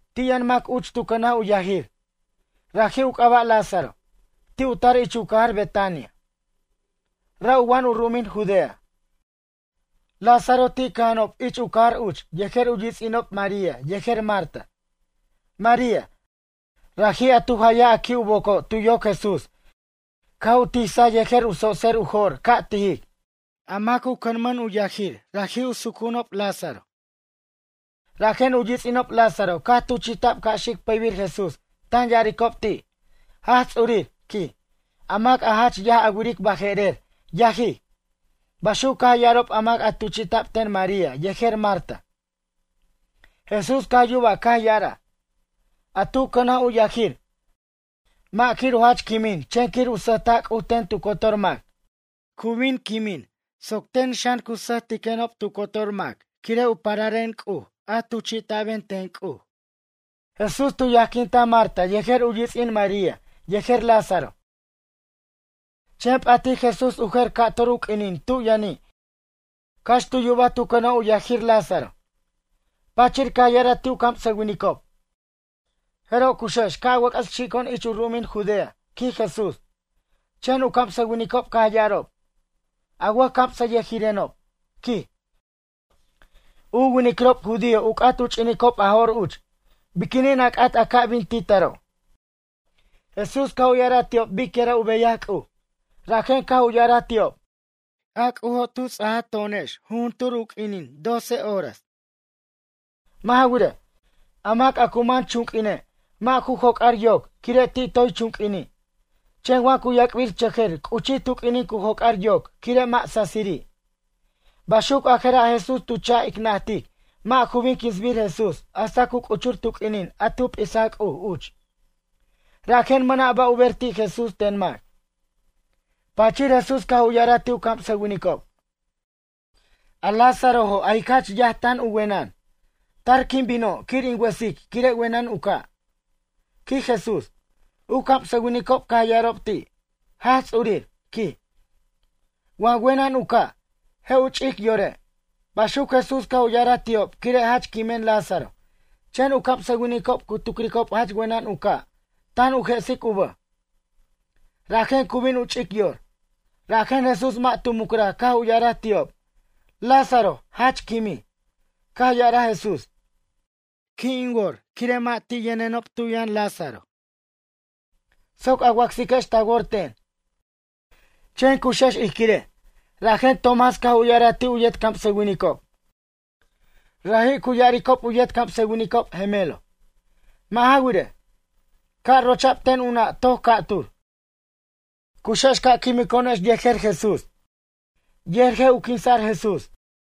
Ti' yʌn mac uch tu cʌnaj u yajir. Raji' u c'aba' Lázaro, ti' u tar uch ich u cajar Betania, ra' u wa'an u ru'umin Judea. Lázaro ti' cʌja'anob ich u cajar uch yejer u yits'inob María yejer Marta. María, raji' a tu jayaj a qui' u boco' tu yoc Jesús caj u tisaj yejer u tsotser u jo'r ca' tijic. A mac u cʌmʌn u yajir raji' u sucu'unob Lázaro. Rajen u yits'inob Lázaro caj tuchi'ta'b ca' xic pʌybir Jesús tan ya'aricob ti': ―Jaj Ts'urir ―quij―, a mac a jach yaj a wiric baje'rer yajij ―baxuc caj ya'arob a mac tuchi'ta'b ten María yejer Marta. Jesús caj yuba caj ya'araj: ―A tu cʌnaj u yajir, mʌ' quir u jach quimin chen quir u sʌjta' C'uj ten tu cotor mac. Cu bin quimij soc ten xan cu sʌjtiquenob tu cotor mac quire' u pararen C'uj a tuchi'ta'ben ten C'uj. Jesús tu yajquintaj Marta yejer u yits'in María yejer Lázaro, chen p'atij Jesús u jer ca'tur u q'uinin tu' yʌni' cax tu yubaj tu cʌnaj u yajir Lázaro. Pachir caj ya'araj ti' u camsʌwinicob: ―Jeroj cuxex ca' wʌc'ʌs xico'on ich u ru'umin Judea ―quij Jesús. Chen u camsʌwinicob caj ya'arob: ―A wʌjcamsʌyʌjirenob ―quij―, u winiquirob judío u c'at u ch'inicob a jo'r uch. Biquinin a c'at a ca' bin ti' taro'? Jesús caj u ya'araj ti'ob bic yira' u beyaj C'uj. Rajen caj u ya'araj ti'ob: ―A C'ujo' tu ts'aj to'onex juntur u q'uinin doce horas. Mʌ' ja wirej, a mac a cu man chunq'uine', mʌ' ju cojar yoc, quire' ti' toy chunq'uini'. Chen wa cu yac'birchʌjʌr c'uchij tu q'uinin cu cojar yoc quire' mʌ' sasiri'. Baxuc a jera' Jesús tu cha' ic najtic mʌ' ju bin quinsbir Jesús hasta cu c'uchur tu q'uinin a tu p'isa C'uj uch. Rajen mʌna' ba' u ber ti' Jesús ten mac. Pachir Jesús caj u ya'araj ti' u camsʌwinicob: ―A Lázarojo' a jic jach yaj tan u wenʌn. Tar quin bino' quir in wʌsic quire' wenʌn u ca' ―quij Jesús. U camsʌwinicob caj ya'arob ti': ―Jaj Ts'urir ―quij―, wa wenʌn u ca', je' u ch'ic yore'. Baxuc Jesús caj u ya'ara ti'ob quire' jach quimen Lázaro chen u camsʌwinicob cu tucricob jach wenʌn u ca' tan u je'sic u bʌj. Rajen cu bin u ch'ic yor. Rajen Jesús mʌ' tu mucraj caj u ya'araj ti'ob: ―Lázaro jach quimij. Caj ya'araj Jesús: ―Qui' in wor quire' mʌ' ti' yʌnenob tu' yʌn Lázaro, soc a wacsiquex ta wor ten. Chen cuxex ij quirej. Rajen Tomás caj u ya'araj ti' u yet camsʌwinicob, raji' cu ya'aricob u yet camsʌwinicob Gemelo, mʌ' ja wirej, caj rocha'b ten u na' toc ca'tur: ―Cuxex ca' quimico'onex yejer Jesús. Yer je' u quinsa'r Jesús.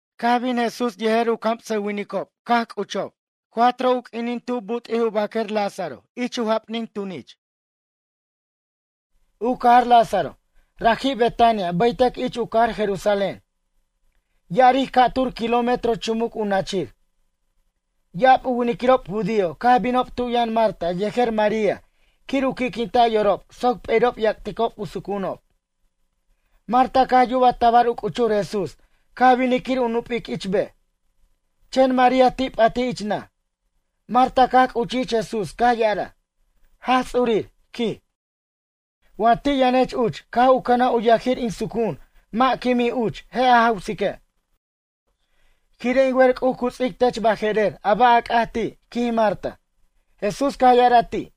Caj u bin Jesús yejer u camsʌwinicob caj c'uchob cuatro u q'uinin tub but'i u baquer ich u jap'nin tunich Lázaro. U cajar Lázaro, raji' Betania baytʌc ich u cajar Jerusalén. Ya'aric ca'tur kilómetro chumuc u nachir. Ya'ab u winiquirob judío caj binob tu' yʌn Marta yejer María quir u qui'quinta' yorob soc p'eri'ob ya'cticob u sucu'unob. Marta caj yuba tabar u c'uchur Jesús caj binij quir u nup'ic ich bej. Chen María ti' p'atij ich naj. Marta caj c'uchij ich Jesús caj ya'araj: ―Jaj Ts'urir ―quij―, wa ti' yʌnech uch caj u cʌnaj u yajir in sucu'un mʌ' quimij uch je' a jawsique'. Quire' in wer C'uj cu ts'ic tech baje'rer a ba' ca c'atic ti' ―quij Marta. Jesús caj ya'araj ti':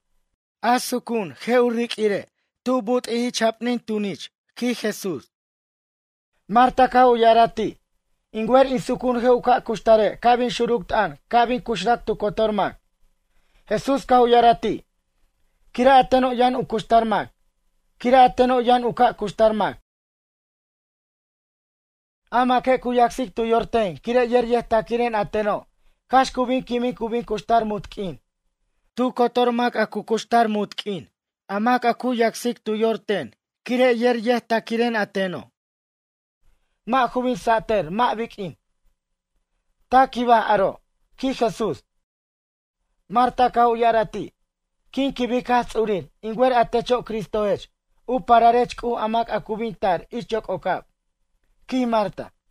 ―A sucu'un je' u riq'uire' tu but'ij ich jap'nin tunich ―quij Jesús. Marta caj u ya'araj ti': ―In wer in sucu'un je' u ca' cuxtare' ca' bin xuruc t'ʌn ca' bin cuxrac tu cotor mac. Jesús caj u ya'araj ti': ―Quire' a teno' yʌn u cuxtar mac. Quire' a teno' yʌn u ca' cuxtar mac, a maque' cu yacsic tu yor ten quire' yer yʌjtaquiren a teno' cax cu bin quimin cu bin cuxtar munt q'uin. Tu cotor mac a cu cuxtar munt q'uin a mac a cu yacsic tu yor ten quire' yer yʌjtaquiren a teno'. Mʌ' ju bin satʌr mʌ' biq'uin. Ta quibaj aro' ―quij Jesús. Marta caj u ya'ara ti': ―Quin quibic Jaj Ts'urir in wer a techo' Cristojech, u pararech C'uj a mac a cu bin tar ich yoc'ocab ―quij Marta.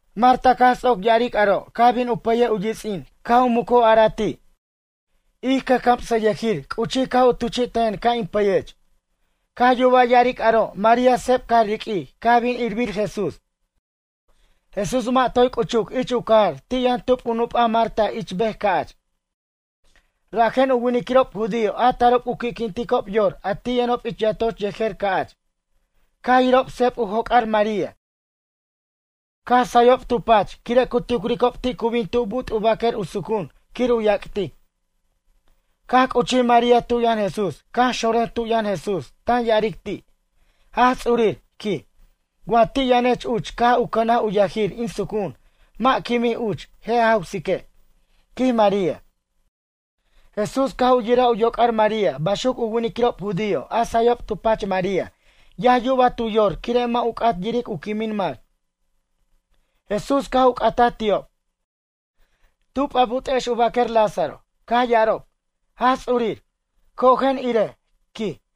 Marta caj ts'oc ya'aric aro' caj bin u pʌyej u yits'in caj u muc u araj ti': ―Ij cʌjcamsʌyʌjir c'uchij caj u tuchi'tajen ca' in pʌyech. Caj yuba ya'aric aro' María seb caj riq'uij caj bin irbir Jesús. Jesús mʌ' toy c'uchuc ich u cajar ti' yʌn tub u nup'a Marta ich bej ca'ch. Rajen u winiquirob judío a tarob u qui'quinticob yor a ti' yʌnob ich yatoch yejer ca'ch. Caj yirob seb u joc'ar María caj sayob tu pach quire' cu tucricob ti' cu bin tu' but' u baquer u sucu'un quir u yactic. Caj c'uchij María tu' yʌn Jesús caj xonrʌj tu' yʌn Jesús tan ya'aric ti': ―Jaj Ts'urir ―quij―, wa ti' yʌnech uch caj u cʌnaj u yajir in sucu'un mʌ' quimij uch je' a jawsique' ―quij María. Jesús caj u yiraj yoc'ar María baxuc u winiquirob judío a sayob tu pach María yaj yubaj tu yor quire' mʌ' u c'at yiric u quimin mac. Jesús caj u c'ataj ti'ob: ―Tub a but'ex u baquer Lázaro? Caj ya'arob: ―Jaj Ts'urir, cojen irej ―quij.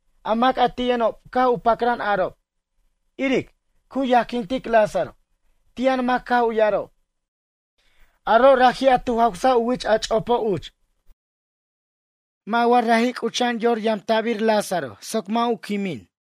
A mac a ti' yʌnob caj u pacran arob: ―Iric, cu yajquintic Lázaro. Ti' yʌn mac caj u ya'arob: ―Aro' raji' a tu jawsaj u wich a ch'opo' uch. Mʌ' wa raji' c'ucha'an yor yamta'bir Lázaro soc mʌ' u quimij?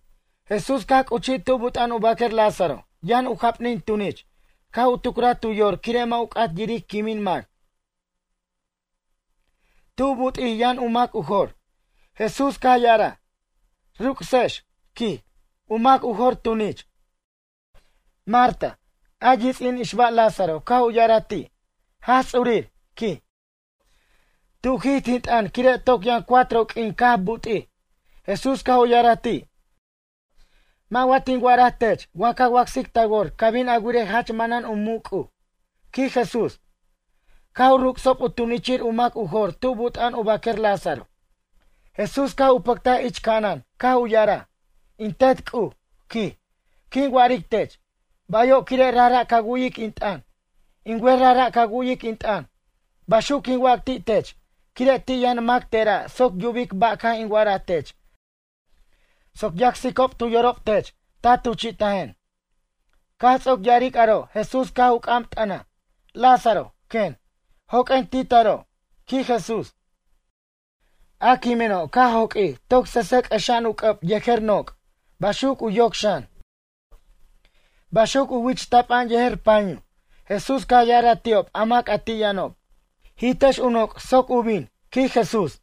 Jesús caj c'uchij tu' but'a'an u baquer Lázaro yʌn u jap'nin tunich caj u tucraj tu yor quire' mʌ' u c'at yiric quimin mac. Tu' but'ij yʌn u mac u jor. Jesús caj ya'araj: ―Ruc'sex ―quij―, u mac u jor tunich. Marta, a yits'in ixba Lázaro caj u ya'araj ti': ―Jaj Ts'urir ―quij―, tu'jij tin t'ʌn quire' toc yʌn cuatro q'uin caj but'ij. Jesús caj u ya'araj ti': ―Mʌ' wa tin wa'araj tech wa ca wacsic ta wor ca bin a wirej jach manan u muc' C'uj? ―quij Jesús. Caj u ruc'sob u tunichir u mac u jor tu' but'a'an u baquer Lázaro. Jesús caj u pʌctaj ich ca'anan caj u ya'araj: ―In Tet C'uj ―quij―, quin wa'aric tech: “Bayo'” quire' rajra' ca wu'yic in t'ʌn. In wer rajra' ca wu'yic in t'ʌn. Baxuc quin wac ti' tech quire' ti' yʌn mac tera' soc yubic ba' caj in wa'araj tech soc yacsicob tu yorob tech ta tuchi'tajen. Caj ts'oc ya'aric aro' Jesús caj u c'am t'ʌnaj: ―Lázaro ―quen―, joq'uen ti' taro' ―quij Jesús. A quimeno' ca' joq'uij toc sʌsʌ c'ʌxa'an u c'ʌb yejer noc', baxuc u yoc xan. Baxuc u wich tapa'an yejer panyu. Jesús caj ya'araj ti'ob a mac ti' yʌnob: ―Jitex u noc' soc u bin ―quij Jesús.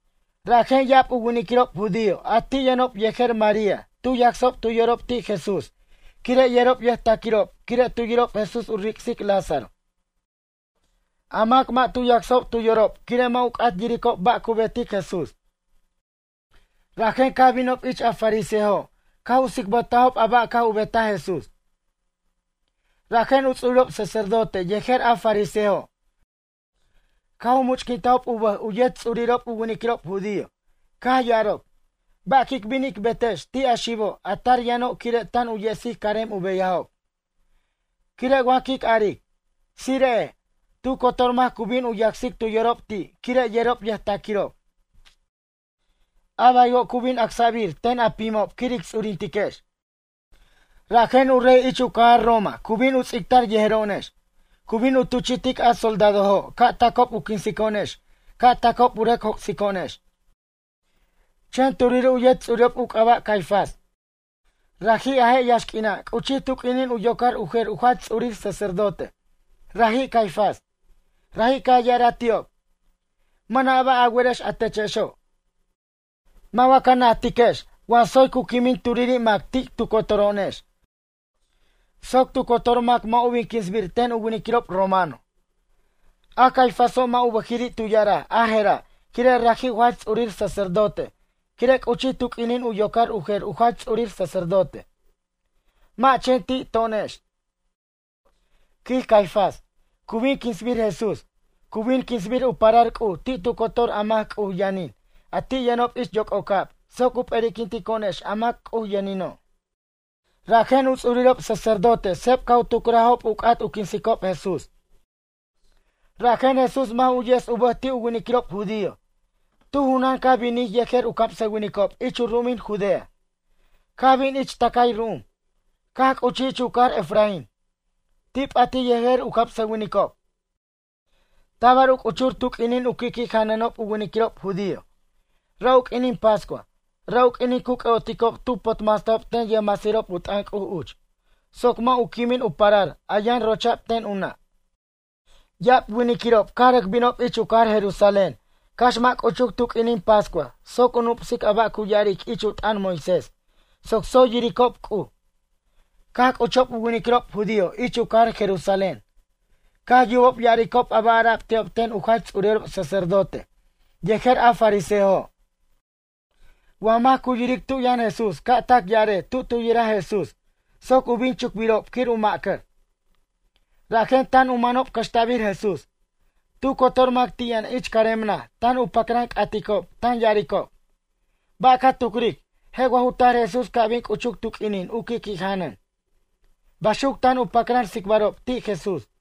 Rajen ya'ab u winiquirob judío a ti' yʌnob yejer María tu yacsob tu yorob ti' Jesús quire' yerob yʌjtaquirob quire' tu yirob Jesús u ric'sic Lázaro. A mac mʌ' tu yacsajob tu yorob quire' mʌ' u c'at yiricob ba' cu betic Jesús. Rajen caj binob ich a fariseojo' caj u tsicbʌtajob a ba' caj u betaj Jesús. Rajen u ts'urirob sacerdote yejer a fariseojo' caj u much'quintajob u bʌj u yet ts'urirob u winiquirob judío, caj ya'arob: ―Ba' quic bin ic betejex ti' a xibo' a tar yʌno' quire' tan u yesic carem u beyajob? Quire' wa quic aric: “Tsire'ej”, tu cotor mac cu bin u yacsicob tu yorob ti' quire' yerob yʌjtaquirob. A baywo' cu bin acsa'bir ten a pimob quir ic ts'urintiquex, rajen u rey ich u cajar Roma cu bin u ts'ictar yejero'onex. Cu bin tuchi'tic a soldadojo' ca' tacob u quinsico'onex ca' tacob u rʌc joc'sico'onex. Chen turiri' u yet ts'urirob u c'aba' Caifás, raji' a je' yaxq'uina' c'uchij tu q'uinin u yocar u jer u jach ts'urir sacerdote, raji' Caifás. Raji' caj ya'araj ti'ob: ―Mʌna' ba' a werex a techexo'. Mʌ' wa ca najtiquex wa tsoy cu quimin turiri' mac ti' tu cotoro'onex soc tu cotor mac mʌ' u bin quinsbir ten u winiquirob romano. A Caifáso' mʌ' u bʌjiri' tu ya'araj a jera' quire' raji' u jach ts'urir sacerdote quire' c'uchij tu q'uinin u yocar u jer u jach ts'urir sacerdote. Mʌ' chen ti' to'onex, quij Caifás, cu bin quinsbir Jesús. Cu bin quinsbir u parar C'uj ti' tu cotor a mac C'uj yʌnin a ti' yʌnob ich yoc'ocab soc u p'eri'quintico'onex a mac a C'uj yʌnino'. Rajen u ts'urirob sacerdote seb caj u tucrajob u c'at u quinsicob Jesús. Rajen Jesús mʌ' ju yes u bʌj ti' u winiquirob judío. Tu junan caj binij yejer u camsʌwinicob ich u ru'umin Judea, caj bin ich tʌcay ru'um. Caj c'uchij ich u cajar Efraín. Ti' p'atij yejer u camsʌwinicob. Tabar u c'uchur tu q'uinin u qui'qui' janʌnob u winiquirob judío. Ra' u q'uinin pascua, ra' u q'uinin cu c'ʌ'oticob tu potmasta'b ten yʌjmasirob u t'ʌn C'uj uch soc mʌ' u quimin u parar a yʌn rocha'b ten u na'. Ya'ab winiquirob caj rʌc binob ich u cajar Jerusalén cax mʌ' c'uchuc tu q'uinin pascua soc u nup'sic a ba' cu ya'aric ich u t'ʌn Moisés soc tsoy yiricob C'uj. Caj c'uchob u winiquirob judío ich u cajar Jerusalén. Caj yubob ya'aricob a ba' ara'b ti'ob ten u jach ts'urirob sacerdote yejer a fariseojo': “Wa mac cu yiric tu' yʌn Jesús ca' tac ya'arej tu' tu yiraj Jesús soc u bin chucbirob quir u ma'cʌr.” Rajen tan u manob cʌxta'bir Jesús. Tu cotor mac ti' yʌn ich carem naj tan u pacran c'aticob tan ya'aricob: ―Ba' ca tucric je' wa ju tar Jesús ca' bin c'uchuc tu q'uinin u qui'qui' janʌn? ―baxuc tan u pacran tsicbarob ti' Jesús.